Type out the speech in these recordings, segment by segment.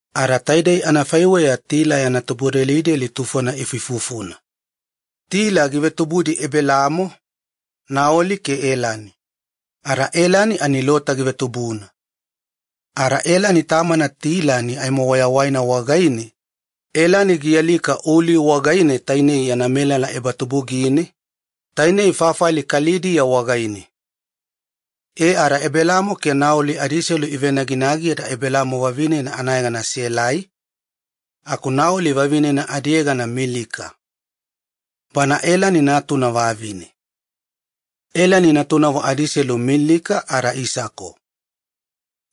Ada taidei anafaiweya Tila ifuifufuna. Tila givetubudi Ebelamo, Naoli ke Elani. Ada Elani ani Lota givetubuna. Ada Elani tamana Tila aimo wayawaina wagaine, Elani gialika Uli wagaine yana melala ebatubugine, tainei fafali Kalidiya wagaine. E ada Ebelamo ke Naoli adiiselu ivenaginagi ada Ebelamo vavinena anayegana Selai, aku Naoli vavinena adiyegana Milika. Bana Elani natuna vavine. Elani natunavo adiiselu Milika ada Isako.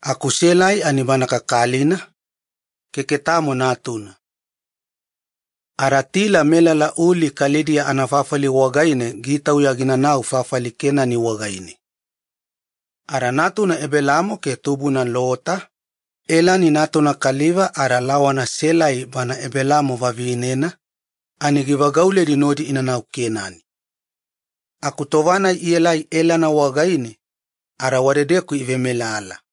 Aku Selai ani bana kakalina, keke tamo natuna. Ada Tila melala Uli Kalidiya anafafali wagaine gitauya ginanau fafali Kenani wagaine, ada natuna Ebelamo ke tubuna Lota, Elani natuna kaliva ada lawana Selai, Ebelamo vavinena ani givagauledi nodi inanau Kenani. Aku tova-nai ielai Elana wagaine, ada wadedeku ivemelala.